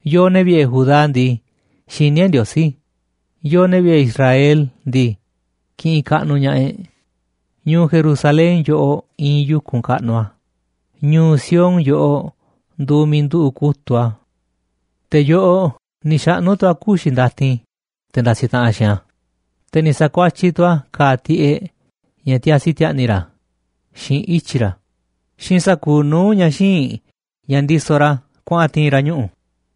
Yooꞌ, ne̱ vi̱ꞌe̱ Judá ndii, xiní e̱ꞌ Ndiosí, yooꞌ, ne̱ vi̱ꞌe̱ Israel ndii, kiꞌinꞌ kaꞌnuꞌ ña̱ꞌaꞌ e̱ꞌ. Ñu̱u̱ Jerusalén yoꞌoꞌ iinꞌ yu̱kunꞌ kaꞌnuꞌ a̱, ñu̱u̱ Sión yoꞌoꞌ nduuꞌ miiꞌ nduꞌu̱ꞌ kutu̱ꞌ a̱. Te̱ yoꞌoꞌ ni̱ xaꞌnu̱ tu̱ a̱ kuxi̱ ndatin te̱ ndasiꞌ taꞌanꞌ xiinꞌ a̱, te̱ ni̱ sa̱kuatyiꞌ tu̱ a̱ ka̱a̱ tiꞌeꞌ ña̱ tiasi ti̱a̱ꞌni̱ ra̱ xiinꞌ ityi̱ ra̱ xiinꞌ sa̱kuuꞌ nuu̱ꞌ ña̱ xíinꞌ ña̱ ndisoꞌ ra̱ kuaꞌa̱n ti̱i̱n ra̱ ñuꞌu̱.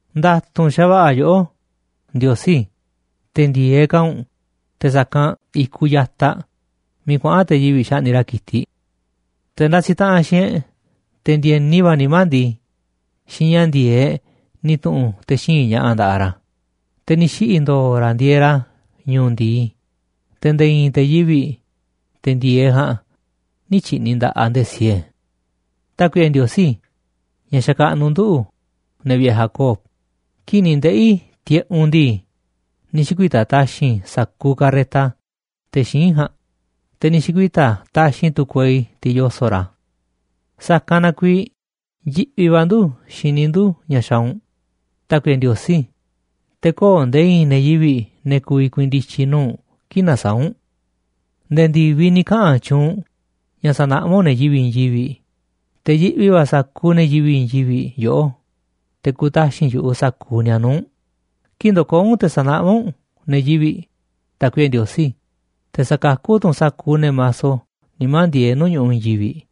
Nda̱tu̱nꞌ xa̱va̱ꞌa̱ yoꞌó, Ndiosí, te̱ ndi̱e̱eꞌ ka̱ u̱nꞌ te̱ sa̱kanꞌ i̱kuꞌ ya̱taꞌ miiꞌ kuaꞌa̱n te̱ yivi̱ꞌ xaꞌni̱ꞌ ra̱ ki̱tiꞌ. Te̱ ndasiꞌ taꞌanꞌ xiinꞌ e̱ꞌ, te̱ ndi̱e̱ni va̱ nimá ndii, xiinꞌ ña̱ ndi̱e̱eꞌ ni̱ tu̱ꞌu̱n te̱ xíinꞌ ña̱ꞌa̱ nda̱ꞌaꞌ ra̱, te̱ ni̱ xiꞌi̱ ndo̱o̱ ra̱ ndieeꞌ ra̱ ñu̱u̱ ndi̱i, te̱ nde̱e̱ i̱i̱n te̱ yivi̱ꞌ, te̱ ndi̱e̱eꞌ ja̱a̱nꞌ, nï̱ tyi̱ꞌni̱ nda̱ꞌaꞌ nde̱e̱ siee. Tákuiꞌe Ndiosí ña̱ xakaꞌnuꞌ nduꞌu̱, ne̱ vi̱ꞌe̱ Jacob, kii̱ꞌ ni̱ ndeꞌi̱ tiꞌeꞌ u̱nꞌ ndii, ni̱ xi̱kuita̱ taxi̱nꞌ sa̱kuuꞌ carreta te̱ xíinꞌ ja̱a̱nꞌ, te̱ ni̱ xi̱kuita̱ taxi̱nꞌ tu̱ kuei, tiꞌ yoso̱ꞌ ra̱. Sa̱kanꞌ na kuiiꞌ yiꞌvi va̱ ndu̱ xini ndu̱ ña̱ xaaꞌ u̱nꞌ, Tákuiꞌe Ndiosí, te̱ köo̱ꞌ nde̱e̱ i̱i̱n ne̱ yivi̱ꞌ, ne̱ ku̱vi̱ ku̱i̱i̱n ndi̱tyi̱ nuu̱ꞌ u̱nꞌ kii̱ꞌ nasaáꞌ u̱nꞌ. Nde̱e̱ ndi̱viꞌ ni̱ kaꞌa̱n tyuunꞌ u̱nꞌ ña̱ sa̱naꞌmá u̱nꞌ ne̱ yivi̱ꞌ i̱i̱n yivi̱ꞌ, te̱ yiꞌvi va̱ sa̱kuuꞌ ne̱ yivi̱ꞌ i̱i̱n yivi̱ꞌ yoꞌó, te̱ ku̱taxi̱nꞌ yu̱ꞌuꞌ sa̱kuuꞌ ni̱a̱ nuu̱ꞌ u̱nꞌ, kii̱ꞌ ndo̱koo̱ u̱nꞌ te̱ sa̱naꞌmá u̱nꞌ ne̱ yivi̱ꞌ, Tákuiꞌe Ndiosí, te̱ sa̱kakú tu̱ u̱nꞌ sa̱kuuꞌ ne̱ maso nimá ndieeꞌ nuu̱ꞌ ñu̱ꞌuꞌ i̱i̱n yivi̱ꞌ.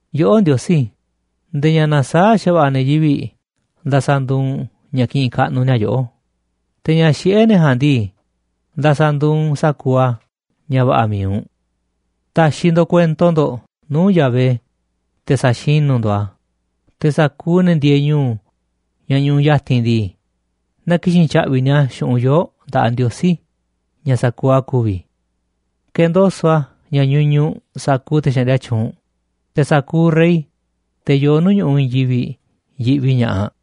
Yoꞌó Ndiosí, nde̱e̱ ña̱ nasaáꞌ xa̱va̱ꞌa̱ ne̱ yivi̱ꞌ nda̱sa̱ ndu̱u̱ u̱nꞌ ña̱ ki̱ꞌi̱n kaꞌnuꞌ ni̱a̱ yoꞌó, te̱ ña̱ xiꞌé ne̱ ja̱a̱nꞌ ndii, nda̱sa̱ nduuꞌ u̱nꞌ sa̱kuuꞌ a̱ ña̱ va̱ꞌa̱ mi̱iꞌ u̱nꞌ. Ta̱xi̱ ndo̱ꞌ kuento ndo̱ꞌ nuu̱ꞌ Yahvé, te̱ sa̱xinú ndo̱ꞌ a̱, te̱ sa̱kuuꞌ ne̱ ndieeꞌ ñu̱u̱ ña̱ ñuꞌuꞌ ya̱ti̱n ndii, na ki̱xi̱n tya̱ꞌvi̱ ni̱a̱ xu̱ꞌunꞌ yoo̱ꞌ nda̱ꞌaꞌ Ndiosí ña̱ sa̱kuuꞌ a̱ ku̱vi̱. Ke̱ndoso̱ꞌ a̱ ña̱ ñuñuꞌ sa̱kuuꞌ te̱ xaꞌndia tyuunꞌ, te̱ sa̱kuuꞌ rey, te̱ yoo nuu̱ꞌ ñu̱ꞌuꞌ i̱i̱n yivi̱ꞌ, yiꞌvi ña̱ꞌaꞌ.